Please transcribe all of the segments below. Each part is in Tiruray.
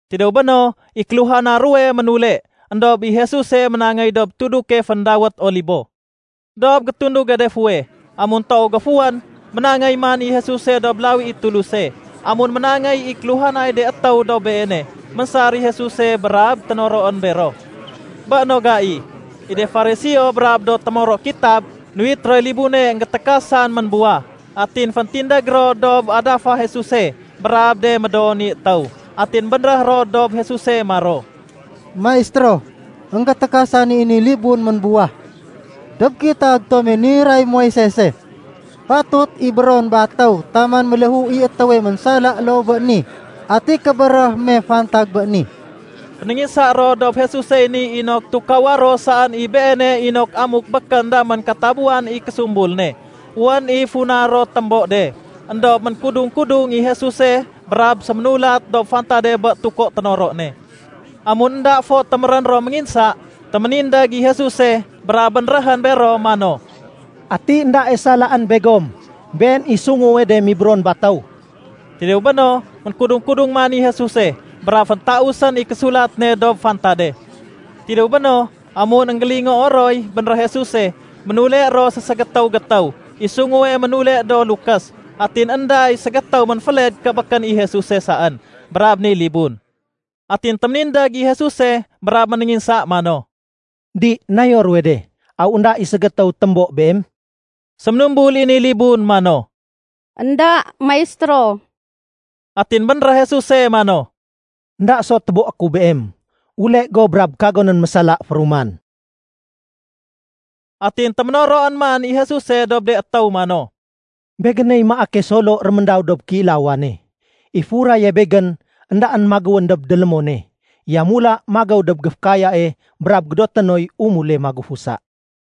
Tidéw béno, i kéluhana ruwe ménule. Endob i Jesuse ménangéy dob tuduke féndawét Olibo. Dob gétunduge de fuweh, amun toow géfuwén, ménangéy man i Jesuse dob lawi i Tuluse. Amun ménangéy i kéluhanay de étéw dob Beene, ménsar i Jesuse brab ténoroén bero. Bé no gai, i de Fariseo brab do témoro kitab, nuwit roy libune énggétékasan ménbuwah. Atin féntindég ro dob adafa Jesuse brab de médoo ni étéw. Atin bénréh ro dob Jesuse maro, “Maistéro, énggétékasan i ni libun ménbuwah. Dob kitab tome niray Moisese, fatut ibéron batéw taman méléhu i étéwe ménsala loo bé ni. Ati kébéréh me fantag bé ni?” Fénénginsa ro dob Jesusey ni inok tukawa ro saén i Beene inok amuk békén damén katabuwan i késumbul ne, wén i funa ro témbo de. Endob ménkudung-kudung i Jesuse brab séménulat dob fantade bé tuko ténoro ne. Amun énda fo témérén ro ménginsa, téménindég i Jesuse brab bénréhén bero mano, “Ati éndae salaén begom, been i sunguwe de mibéron batéw.” Tidéw béno, ménkudung-kudung man i Jesuse brab féntausén i késulat ne dob fantade. Tidéw béno, amun énggélingoo roy bénréh Jesuse, ménule ro séségétéw-gétéw, i sunguwe ménule do lukés. Atin énda i ségétéw ménféled ké békén i Jesuse saén brab ni libun. Atin téménindég i Jesuse brab ménénginsa mano, “Di, nayo ruwe de? Aw énda i ségétéw témbo beem?” Séménumbul i ni libun mano, “Enda, Maistéro.” Atin bénréh Jesuse mano, “Enda so téboé ku beem. Ule go brab kagonén mésala féruman.” Atin téménoroén man i Jesuse dob de étéw mano, “Begéney maake solo réméndaw dob kéilawane. I furaye Begén éndaén magéwén dob délémone, yamula magéw dob géfékayae brab gédoté noy umule magufusa.”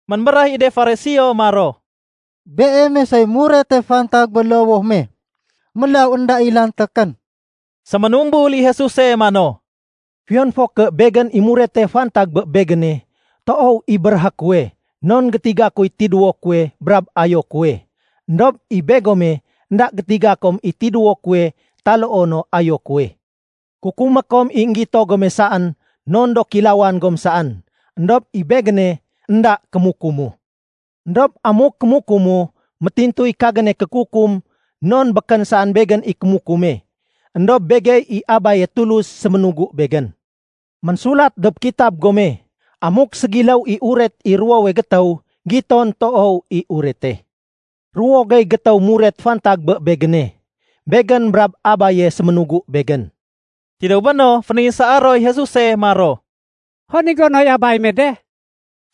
Ménbéréh i de Fariseo maro, “Beeme soy murete fantag bé lowoh me, mélaw énda i lantékén.” Séménumbul i Jesuse mano, “Fiyon fo ké Begén i murete fantag bé Begéne, toow i béréhé kuwe non gétiga kuy tidéwo kuwe brab ayo kuwe. Endob i begome, énda gétiga kom i tidéwo kuwe taloo no ayo kuwe. Kukumé kom i énggito gome saén non do kéilawan gom saén. Endob i Begéne, énda kémukumu. Endob amuk kémukumu, métintuy kagéne kékukum non békén saén Begén i kémukume, éndob Begey i Abaye Tulus séménugu Begén. Ménsulat dob kitab gome, amuk ségiléw i uret i ruwowe gétéw, giton toow i urete. Ruwo gey gétéw muret fantag bé Begéne. Begén brab Abaye séménugu Begén.” Tidéw béno, fénénginsaa roy Jesuse maro, “Hon i gonoy Abay me de?”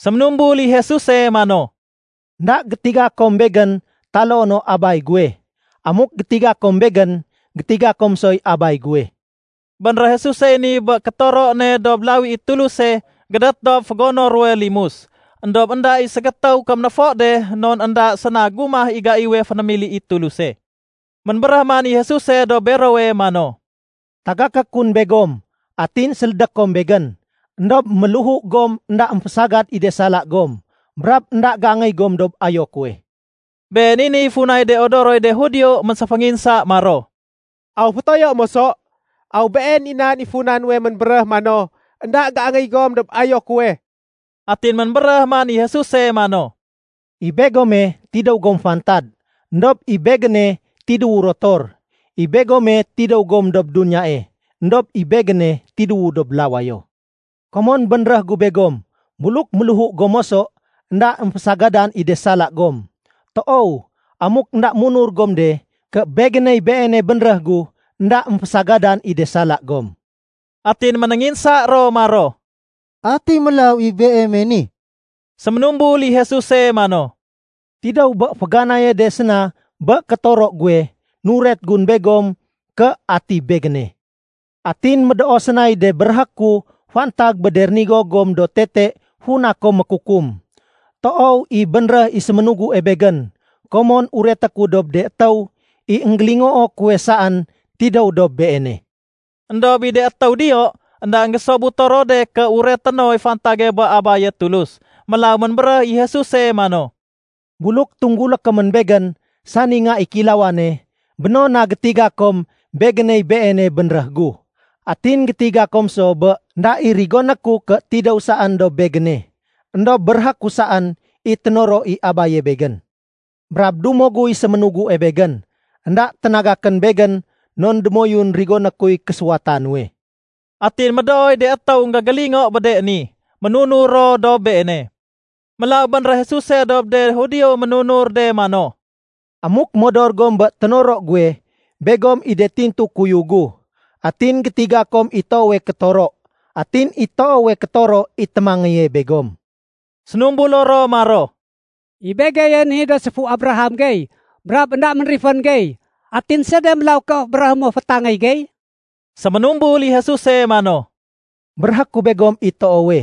Séménumbul i Jesuse mano, “Enda gétiga kom Begén taloo no Abay guwe. Amuk gétiga kom Begén, gétiga kom soy Abay guwe.” Bénréh Jesusey ni bé kétoro ne dob lawi i Tuluse gédét dob fégono ruwe limus. Endob énda i ségétéw kéménéfo de non énda séna gumah i gaiwe fénémili i Tuluse. Ménbéréh man i Jesuse dob berowe mano, “Tagaké kun begom, atin sélédé kom Begén. Endob méléhu gom énda émfésagad i de sala gom, brab énda géangéy gom dob ayo kuwe.” Been i niy funay de odoroy de Judio ménséfénginsa maro, “Aw fétoyo moso? Aw been i nan i funa nuwe ménbéréh mano, ‘Enda géangéy gom dob ayo kuwe?’” Atin ménbéréh man i Jesuse mano, “I begome, tidéw gom fantad, éndob i Begéne tidéwu rotor. I begome, tidéw gom dob duniyae, éndob i Begéne tidéwu dob lawayo. Komon bénréh gu begom buluk méléhu gom moso, énda émfésagadan i de sala gom. Toow, amuk énda munur gom de ké Begéney Beene bénréh gu, énda émfésagadan i de sala gom.” Atin ménénginsa ro maro, “Ati mélaw i Beeme ni?” Séménumbul i Jesuse mano, “Tidéw bé féganaye de séna bé kétoro guwe, nuret gun begom ké ati Begéne. Atin médoo sénay de béréhé ku fantag bé de rénigo gom do tete funa kom mékukum. Toow i bénréh i séménugue Begén, komon ureté ku dob de étéw i énggélingoo kuwe saén tidéw dob Beene.” Endob i de étéw diyo, énda énggésobuto ro de ké ureté noy fantage bé Abaye Tulus. Mélaw ménbéréh i Jesuse mano, “Buluk tunggulé komén Begén, sani Nga i Kéilawane, béno na gétiga kom Begéney Beene bénréh gu. Atin gétiga kom so bé énda i rigoné ku ké tidéw saén dob Begéne, éndob béréhé ku saén i ténoro i Abaye Begén. Brab dumo guy séménugue Begén. Enda ténagakén Begén non démoyun rigoné kuy késuwata nuwe.” Atin médooy de étéw énggégélingo bé de ni, ménunur ro dob Beene. Mélaw bénréh Jesuse dob de Judio ménunur de mano, “Amuk modor gom bé ténoro guwe, begom i de tintu kuyug gu, atin gétiga kom i toowe kétoro, atin i toowe kétoro i témangéye begom.” Sénumbulo ro maro, “I begeye ni do séfu Abraham gey brab énda ménrifén gey, atin sede mélaw ké béréhé mo fétangéy gey?” Séménumbul i Jesuse mano, “Béréhé ku begom i toowe,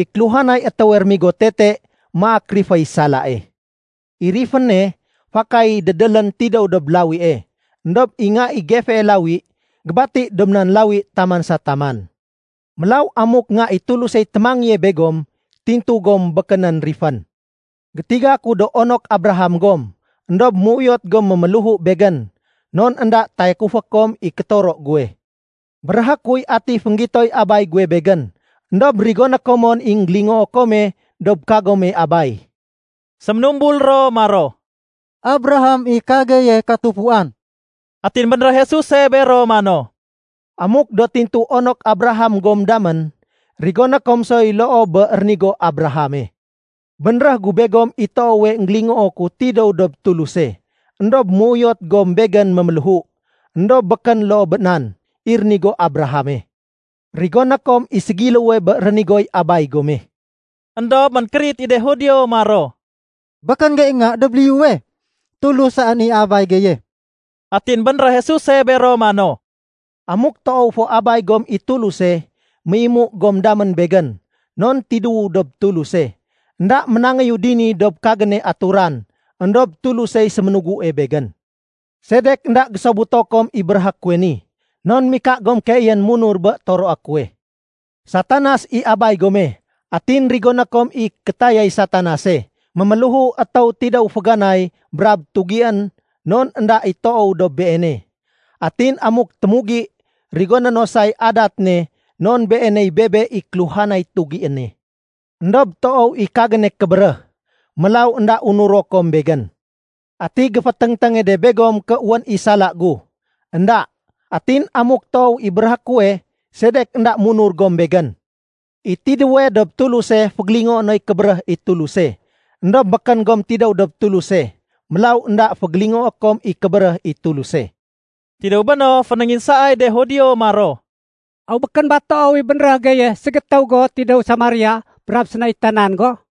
i kéluhanay étéwe rémigo tete maak riféy salae. I riféne, fakay dédélén tidéw dob lawie. Endob i nga i gefee lawi, gébati dob nan lawi taman sa taman. Mélaw amuk Nga i Tulusey témangéye begom, tintu gom békénén rifén. Gétiga ku do onok Abraham gom. Endob méuyot gom méméléhu Begén, non énda tayakufé kom i kétoro guwe. Béréhé kuy ati fénggitoy Abay guwe Begén, éndob rigoné kom mon i énggélingoo kome dob kagome abay.” Séménumbul ro maro, “Abraham i kageye katufuan.” Atin bénréh Jesuse bero mano, “Amuk do tintu onok Abraham gom damén, rigoné kom soy loo bé rénigo Abrahame. Bénréh gu begom i toowe énggélingoo ku tidéw dob Tuluse, éndob méuyot gom Begén méméléhu. Endob békén loo bé nan i rénigo Abrahame. Rigoné kom i ségiléwe bé rénigoy abay gome.” Endob ménkérit i de Judio maro, “Békén gey nga dob liyuwe, Tulus saén i Abay geye.” Atin bénréh Jesuse bero mano, “Amuk toow fo Abay gom i Tuluse, méimu gom damén Begén, non tidéwu dob Tuluse. Enda ménangéyu dini dob kagéne aturan, éndob Tulusey séménugue Begén. Sedek énda gésobuto kom i béréhé kuwe ni? Non mika gom keeyén munur bé toroé kuwe. Satanas i abay gome atin rigoné kom i kétayay Satanase. Méméléhu étéw tidéw féganay brab tugién non énda i toow dob beene. Atin amuk témugi, rigoné no say adat ne non beeney bebe i kéluhanay tugiéne. Endob toow i kagéne kébéréh, mélaw énda unuro kom Begén. Ati géféténgténge de begom ké wén i sala gu? Enda. Atin amuk toow i béréhé kuwe, sedek énda munur gom Begén? I tidéwe dob Tuluse fégélingoé noy kébéréh i Tuluse. Endob békén gom tidéw dob Tuluse, mélaw énda fégélingoé kom i kébéréh i Tuluse.” Tidéw béno, fénénginsaay de Judio maro, “Aw békén ba toow i bénréh geye ségétéw go tidéw Samaria brab sénaitanan go?”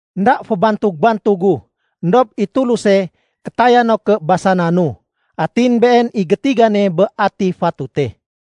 Enda fébantug-bantugu, éndob i Tuluse kétaya no ké basananu, atin Been i gétigane bé ati fatute.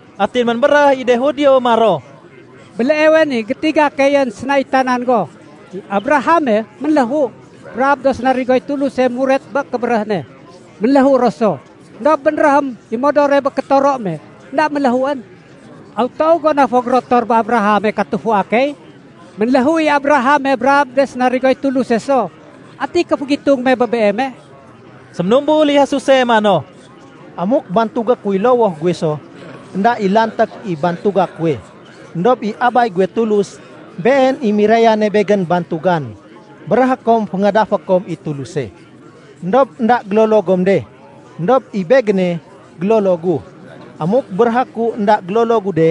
Atin ménbéréh i de Judio maro, “Béleewe ni gétiga keyén sénaitanan go. I Abrahame ménléhu, brab do sénarigoy Tuluse muret bé kébéréh ne, ménléhu ro so. Endob bénréhém i modore bé kétoro me énda méléhuén. Aw toow go na fo gérotor bé Abrahame katufua key? Ménléhu i Abrahame brab de sénarigoy Tuluse so. Ati kéfégitung me bé Beeme?” Séménumbul i Jesuse mano, “Amuk bantugé kuy lowoh guwe so, énda i lanték i bantuga kuwe. Endob i Abay guwe Tulus, Been i mirayane Begén bantugan. Béréhé kom féngadafé kom i Tuluse. Endob énda gélolo gom de. Endob i Begéne, gélolo gu. Amuk béréhé ku énda gélolo gu de,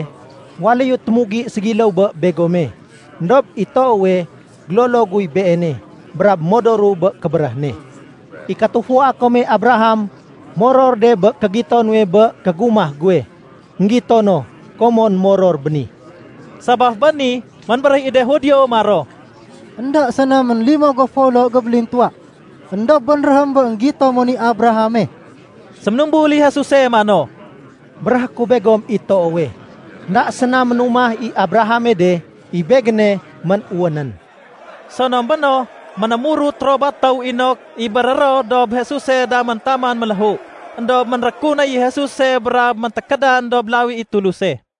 waléyu témugi ségiléw bé begome. Endob i toowe, gélolo guy Beene, brab modoru bé kébéréh ne. I katufua kome Abraham moror de bé kégito nuwe bé kégumah guwe. Enggito no, komon moror béni.” Sabaf bé ni, ménbéréh i de Judio maro, “Enda séna ménlimo go folo gébélintuwa, éndob bénréhém bé énggito mon i Abrahame?” Séménumbul i Jesuse mano, “Béréhé ku begom i toowe, énda séna ménumah i Abrahame de, i Begéne ménwénén.” Sonom béno, ménémurut ro batéw inok ibéré ro dob Jesuse damén taman méléhu, éndob ménrékunéy i Jesuse brab méntékédan dob lawi i Tuluse.